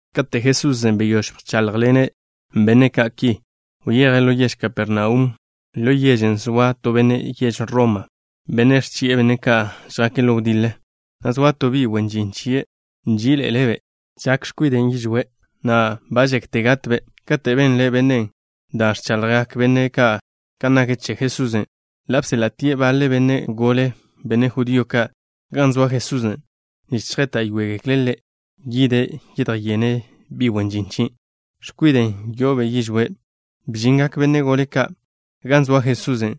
Kate' Jesusen' beyóž bcháḻjḻene' benne' ka' ki, wyeje' ḻo yež Kapernaum. Ḻo yežen' zoa to benne' yež Roma, benne' ẕchi'e benne' ka' žjake' ḻo wdiḻe, na' zoa to bi' wen žin chie' nží'iḻe'ele'-be'. Yo'o yižwé' x̱kwiden', na' ba žekte gatbe'. Kate' benle bennen' da' ẕchaḻjgak benne' ka' kan nak che Jesusen', ḻa' bséḻa'tie' baḻe benne' gole, benne' judío ka', gan zoa Jesusen', nich chjéta'yoegekle' Ḻe' yide' yedjyene' bi' wen žin chien', x̱kwiden' yo'obe' yižwé'. Bžingak benne' gole ka' gan zoa Jesusen',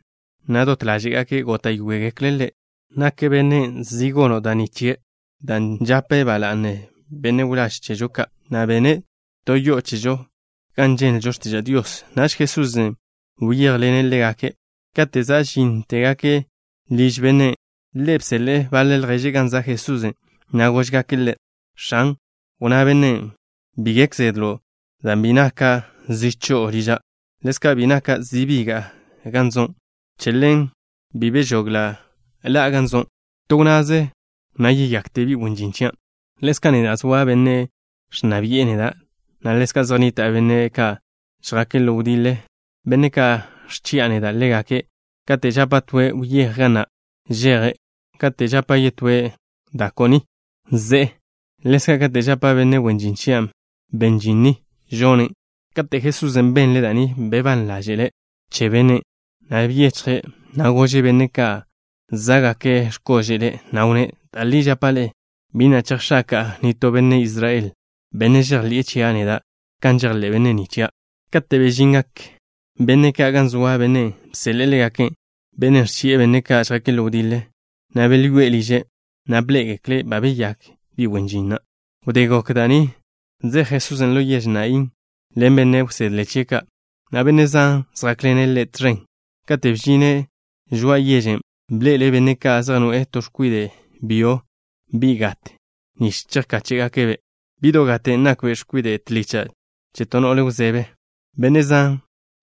na' dot ḻáže'gake' góta'yoegekle' Ḻe', na' wnnágake': —Nak zi bennen' gono' da' ni chie', dan' žape' ba la'ne benne' wláž chežo ka', na' bene' to yo'o chežo gan ženlžo x̱tiža' Dios. Naž Jesusen' wyéjḻene' ḻégake'. Kate' za' žíntegake' liž bennen', ḻe' bseḻe'e baḻe lježe' gan za' Jesusen', na' góžgake' Ḻe': —X̱an, wnná bennen': “Bi gek zedlo', dan' bi naka' zi cho'o liža'. Ḻezka' bi naka' zi biga'a gan zo'. Che ḻen bi bežogla' ḻa'a gan zo'. To wnnaze, na' yeyakte bi' wen žin chian'. Ḻezka' neda', zoa benne' ẕnna bi'e neda', na' ḻezka' zej nnita' benne' ka' žjake' ḻo wdiḻe, benne' ka' ẕchi'a neda' ḻégake'. Kate' žapa' toe': Wyéj ga na', žeje'. Kate' žapa' yetóe': Da ko' ni, ze'e. Ḻezka' kate' žapa' benne' wen žin chia': Ben žin ni, žonen'.” Kate' Jesusen' benle' da' ni, bebán ḻáže'le' che bennen', na' byechje', na' gože' benne' ka' zá'gake' x̱kóže'le', na' wnné': —Da' li žapa' ḻe'e, bi na' chejx̱aka'a nitó benne' Israel, benne' žejḻi'e chia' neda' kan žejḻé' benne' ni chia'. Kate' bežingak benne' ka' gan zoa bennen' bseḻe'e ḻégake', bennen' ẕchi'e benne' ka' žjake' ḻo wdiḻe, na' belyoé'e liže', na' bḻé'egekle' ba beyák bi' wen žin na'. Wdé gok da' ni, zej Jesusen' ḻo yež Naín ḻen benne' wsedle chie' ka', na' benne' zan zjákḻene' Ḻe' tẕen. Kate' bžine' žoa'a yežen', bḻe'ele' benne' ka' zej noe'e to x̱kwide' byo, bi' gat, nich chejkáche'gake'-be'. Bi'do' gaten' nakbe' x̱kwide' tlicha' che to no'le wzebe. Benne' zan,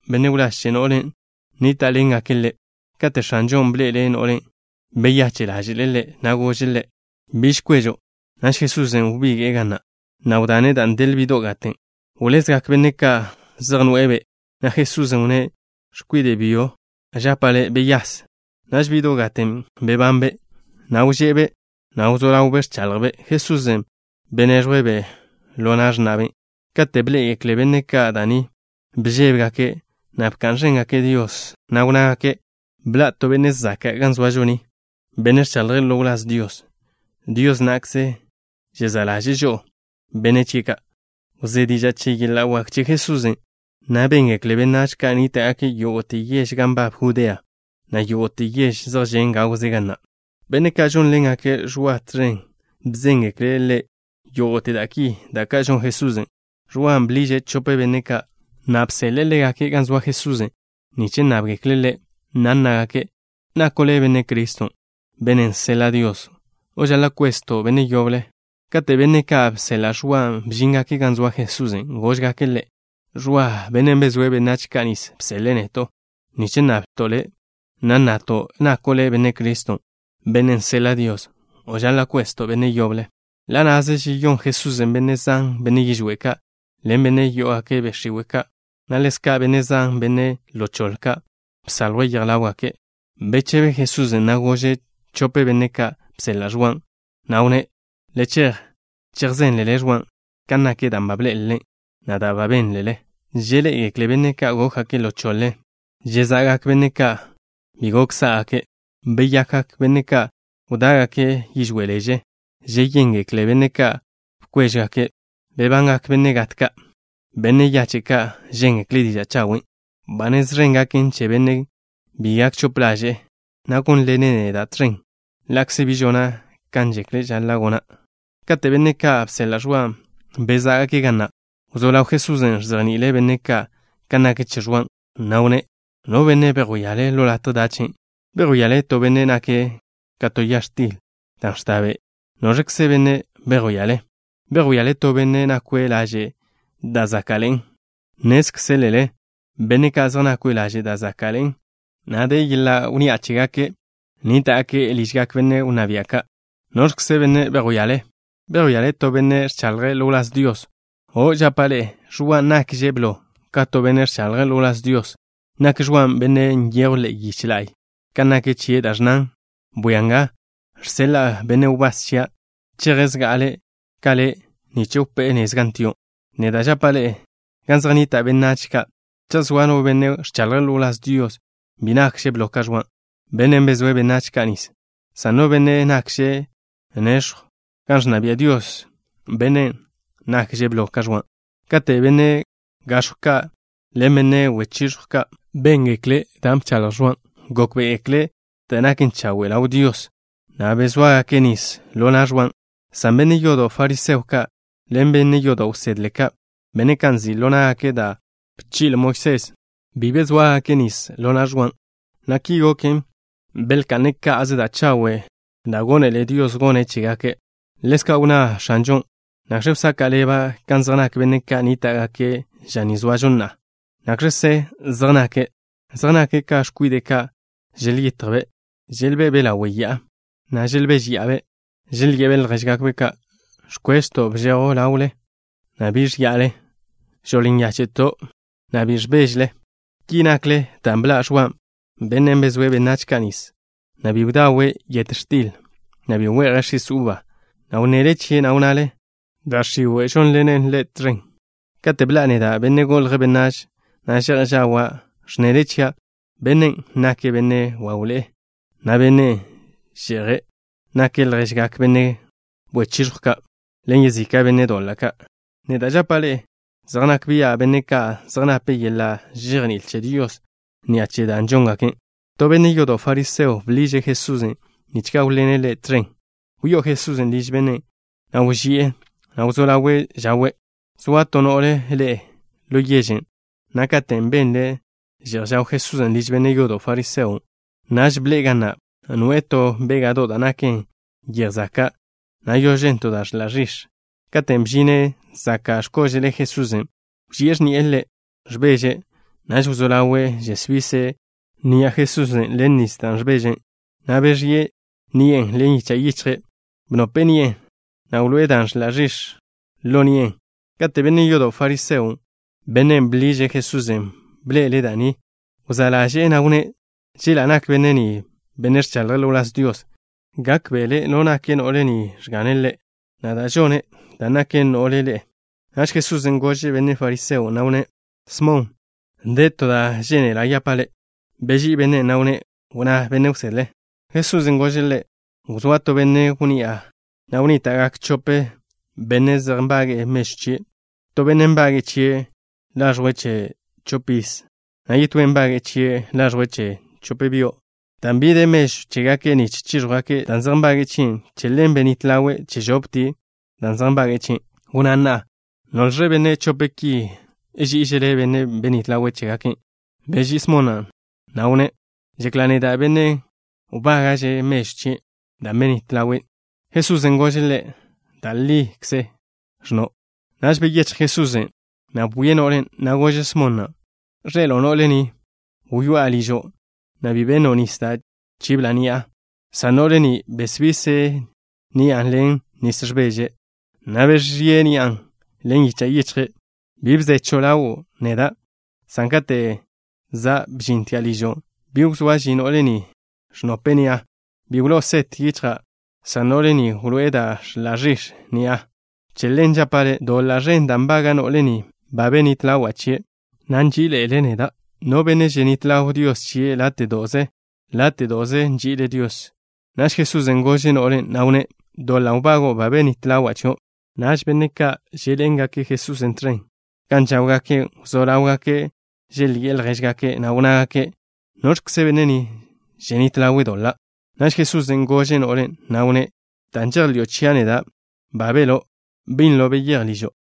benne' wláž che no'len', nníta'ḻengake' ḻe'. Kate' X̱anžon' bḻe'ele' no'len', beyache' ḻáže'le' ḻe', na' gože' ḻe': —Biž kwežo'. Naž Jesusen' wbige'e ga na', na' wdane' dan' del bi'do' gaten'. Wlezgak benne' ka' zej noe'e-be', na' Jesusen' wnné': —X̱kwide' byo, žapa' le', beyase. Naž bi'do' gaten' bebanbe', na' wže'be', na' wzó ḻawbe' ẕchaḻjbe'. Jesusen' beneẕjwe'-be' ḻo na' x̱na'be'. Kate' bḻé'egekle benne' ka' da' ni, bžébegake', na' bka'n ẕéngake' Dios, na' wnnágake': —Bḻa' to benne' zaka' ga zoažo ni, benne' ẕchaḻje' ḻo wláz Dios. Dios na'kze žezá' ḻaže'e chežo, benne' chie' ka'. Wzé diža' che yeḻa' wak che Jesusen', na' béngekle benách ka' nníta'gake' yógo'te yež gan nbab Judea, na' yógo'te yež zej žen' gawze ga na'. Benne' ka' žónḻengake' Ẕwa tẕen bzéngekle' ḻe' yógo'te da' ki, da' ka' žon Jesusen'. Ẕwan' bliže' chope benne' ka', na' bseḻe'e ḻégake' gan zoa Jesusen' nich nnábgekle' Ḻe', na' nnágake': ¿Nako' le' Benne' Criston', bennen' seḻa' Dios, o žaḻa' kwezto' benne' yoble? Kate' benne' ka' bseḻa' Ẕwan' bžíngake' gan zoa Jesusen', góžgake' Ḻe': —Ẕwa, bennen' bezóe' benách ka' nis bseḻe'e neto', nich nnablto' Le', na' nnato': ¿Nako' le' Benne' Criston', bennen' seḻa' Dios, o žaḻa' kwezto' benne' yoble? Ḻa' na'ze žeyón Jesusen' benne' zan, benne' yižwé' ka', ḻen benne' yó'ogake' be' x̱iwe' ka', na' ḻezka' benne' zan, benne' ḻo choḻe ka', bsaljwe' yej ḻáwgake'. Bechebe Jesusen', na' gože' chope benne' ka' bseḻa' Ẕwan', na' wnné': —Le chej, chejzénlele Ẕwan' kan nak da' bḻé'elele, na' da' bénlele. Žeḻé'egekle benne' ka' gókgake' ḻo choḻe. Žeza'gak benne' ka' bi gok sá'gake'. Beyakgak benne' ka' wdá'gake' yižwé' leže. Žeyéngekle benne' ka' bkwéžjwgake'. Bebangak benne' gat ka'. Benne' yache' ka' žéngekle' diža' chawen'. Ba nez ẕen gaken che bennen' bi gak chope ḻaže'e, na' gónḻene' neda' tẕen ḻa'kze bi žona' kan žekle' žaḻa' gona'. Kate' benne' ka' bseḻa' Ẕwan' bezá'gake' ga na', wzó ḻaw Jesusen' ẕzejni'ile' benne' ka' kan nak che Ẕwan', na' wnné': —¿No benne' bejwíale ḻo latje dachen'? ¿Bejwíale to benne' nake' ka to ya x̱til dan' ẕta be'? ¿Noẕkze benne' bejwíale? ¿Bejwíale to benne' nakwe' laže' da' záka'ḻe'en? Nnézkzelele benne' ka' zej nakwe' laže' da' záka'ḻe'en, na' de yeḻa' wnni'a chégake' nníta'gake' ližgak benne' wnná bia' ka'. ¿Noẕkze benne' bejwíale? ¿Bejwíale to benne' ẕchaḻje' ḻo wláz Dios? O', žapa' ḻe'e. Ẕwan' nakže' blo ka to benne' ẕchaḻje' ḻo wláz Dios. Nak Ẕwan' bennen' nyejw ḻe'e yich la'y kan nak chie' da' ẕnnan: Bwia nga, žseḻa'a benne' wbás chia'. Cheje' zga'ale' ka Le' nich wpé'e nez gan tio'. Neda' žapa' ḻe'e: gan zej nnita' benách ka', cha' zoa no benne' ẕchaḻje' ḻo wláz Dios, bi nakže' blo ka Ẕwan', bennen' bezóe' benách ka' nis, san no benne' nakže' nex̱jw gan ẕnna bia' Dios, bennen' nakže' blo ka Ẕwan'. Kate' benne' gax̱jw ka' ḻen benne' wechiẕjw ka', béngekle' da' bchaḻj Ẕwan', gókbe'egekle' da' naken chawe' ḻaw Dios, na' bezóagake' nis ḻo na' Ẕwan', san benne' yodo' fariseo ka' ḻen benne' yodo' wsedle ka', benne' ka' nzi' ḻo ná'gake' da' bchi'le Moisés, bi bezóagake' nis ḻo na' Ẕwan', na' ki goken, belka'ne' ka'ze da' chawe' da' gónele Dios gone' chégake'. Ḻezka' wnná X̱anžon': —¿Nakx̱ wsaka' ḻeba' kan zej nak benne' ka' nníta'gake' ža ni zoažo na'a? ¿Nakx̱kze zej nake'? Zej nake' ka x̱kwide' ka' želyitjbe'. Želbe'be' ḻawe' ya'a, na' želbéžeya'abe'. Želye'be' ljéžgakbe': “Ẕkwežto' bžejw ḻawle, na' bi žia'le. Žoḻ nyáche'to', na' bi ẕbéžele.” Ki nakle dan' bḻa' Ẕwan', bennen' bezóe' benách ka' nis, na' bi bdawe' yet x̱til, na' bi we'je' x̱is uba, na' wnnele chie', na' wnnale: “Da' x̱iwe' žónḻenen ḻe' tẕen.” Kate' bḻa'a neda', Benne' Golje' Benách, na' že'j žawa', ẕnnele chia': “Bennen' nake' benne' wawḻe'e, na' benne' že'je'. Nake' lježgak benne' wechiẕjw ka' ḻen yezika' benne' doḻa' ka'.” Neda' žapa' ḻe'e: zej nak bia' benne' ka' zej nape' yeḻa' žejní'il che Dios ni'a che da' žóngake'. To benne' yodo' fariseo bḻiže' Jesusen' nich gáwḻene' ḻe' tẕen. Wyó'o Jesusen' liž bennen', na' wži'e, na' wzó ḻawe' žawe'. Zoa to no'le ḻe'e ḻo yežen', na' katen' benle' že'j žaw Jesusen' liž benne' yodo' fariseon', naž bḻe'e ga na', noe'e to béga'do' da' naken yej zaka', na' yožen to da' ẕḻa' ẕix̱. Katen' bžine' zaka' x̱kóže'le Jesusen', wži'e x̱ni'e Ḻe', ẕbeže'. Naž wzó ḻawe' žesbise' ni'a Jesusen' ḻen nis ẕbeže', na' beẕíe' ni'e ḻen yicha' yichje'. Bnope'e ni'e, na' wloé'e dan' ẕḻa' ẕix̱ ḻo ni'e. Kate' benne' yodo' fariseon', bennen' bḻiže' Jesusen', bḻe'ele' da' ni, wzá' ḻaže'e, na' wnné': “Chela' nak benne' ni benne' ẕchaḻje' ḻo wláz Dios, gákbe'ele' da' nak no'le ni ẕgane' Ḻe', na' da' žone', dan' nake' no'le ḻe'e.” Naž Jesusen' gože' benne' fariseon', na' wnné': —Smon, de to da' žénela' yapa' le'. Beží'i bennen', na' wnné': —Wnná, benne' wsedle. Jesusen' gože' ḻe': —Wzóa to benne' wnni'a, na' wnníta'gak chope benne' zej nbage'e mežw chie'. To bennen' nbage'e chie' laẕjwe' che chopiz, na' yetóen' nbage'e chie' laẕjwe' che chop byo'. Dan' bi de mežw chégake' nich chíẕjwgake' dan' zej nbage'e chie', che ḻen benít ḻawe' che žoptie' dan' zej nbage'e chie'. Wnná na'a. ¿Noẕle benne' chope' ki ží'ižele' bennen' benít ḻawe' chégake'? Beží'i Smon na', na' wnné': —Žekla' neda', bennen' wbága'že' mežw chie', dan' benít ḻawe'. Jesusen' gože' ḻe': —Da' likze ẕnno'. Naž beyéchj Jesusen', na' bwie' no'len', na' gože' Smon na': —¿Ẕḻe'elo' no'le ni? Wyoá'a ližo', na' bi benno' nis da' chibla' ni'a, san no'le ni besbise' ni'a ḻen nis ẕbeže', na' beẕíe' ni'a ḻen yicha' yichje'. Bi bzechw ḻawo' neda', san kate' za' bžintia' ližo', bi wzóa ži no'le ni, ẕnope'e ni'a. Bi wló'o set yichja', san no'le ni wloé'e dan' ẕḻa' ẕix̱ ni'a. Che ḻen žapa' le', doḻa' ẕen dan' wbaga' no'le ni, ba benít ḻawa' chie', na' nží'iḻe'ele' neda'. No benne' ženít ḻaw Dios chie' láte'do'ze, láte'do'ze nži'ile' Dios. Naž Jesusen' gože' no'len', na' wnné': —Doḻa' wbago'o ba benít ḻawa' chio'. Naž benne' ka' želbé'ḻene' Jesusen' tẕen gan žáwgake' wzó ḻáwgake' želyi'e ljéžgake', na' wnnágake': —¿Noẕkze benne' ni, ženít ḻawe' doḻa'? Naž Jesusen' gože' no'len', na' wnné': —Dan' žejḻi'o chia' neda', ba beló'. Binlo beyéj ližo'.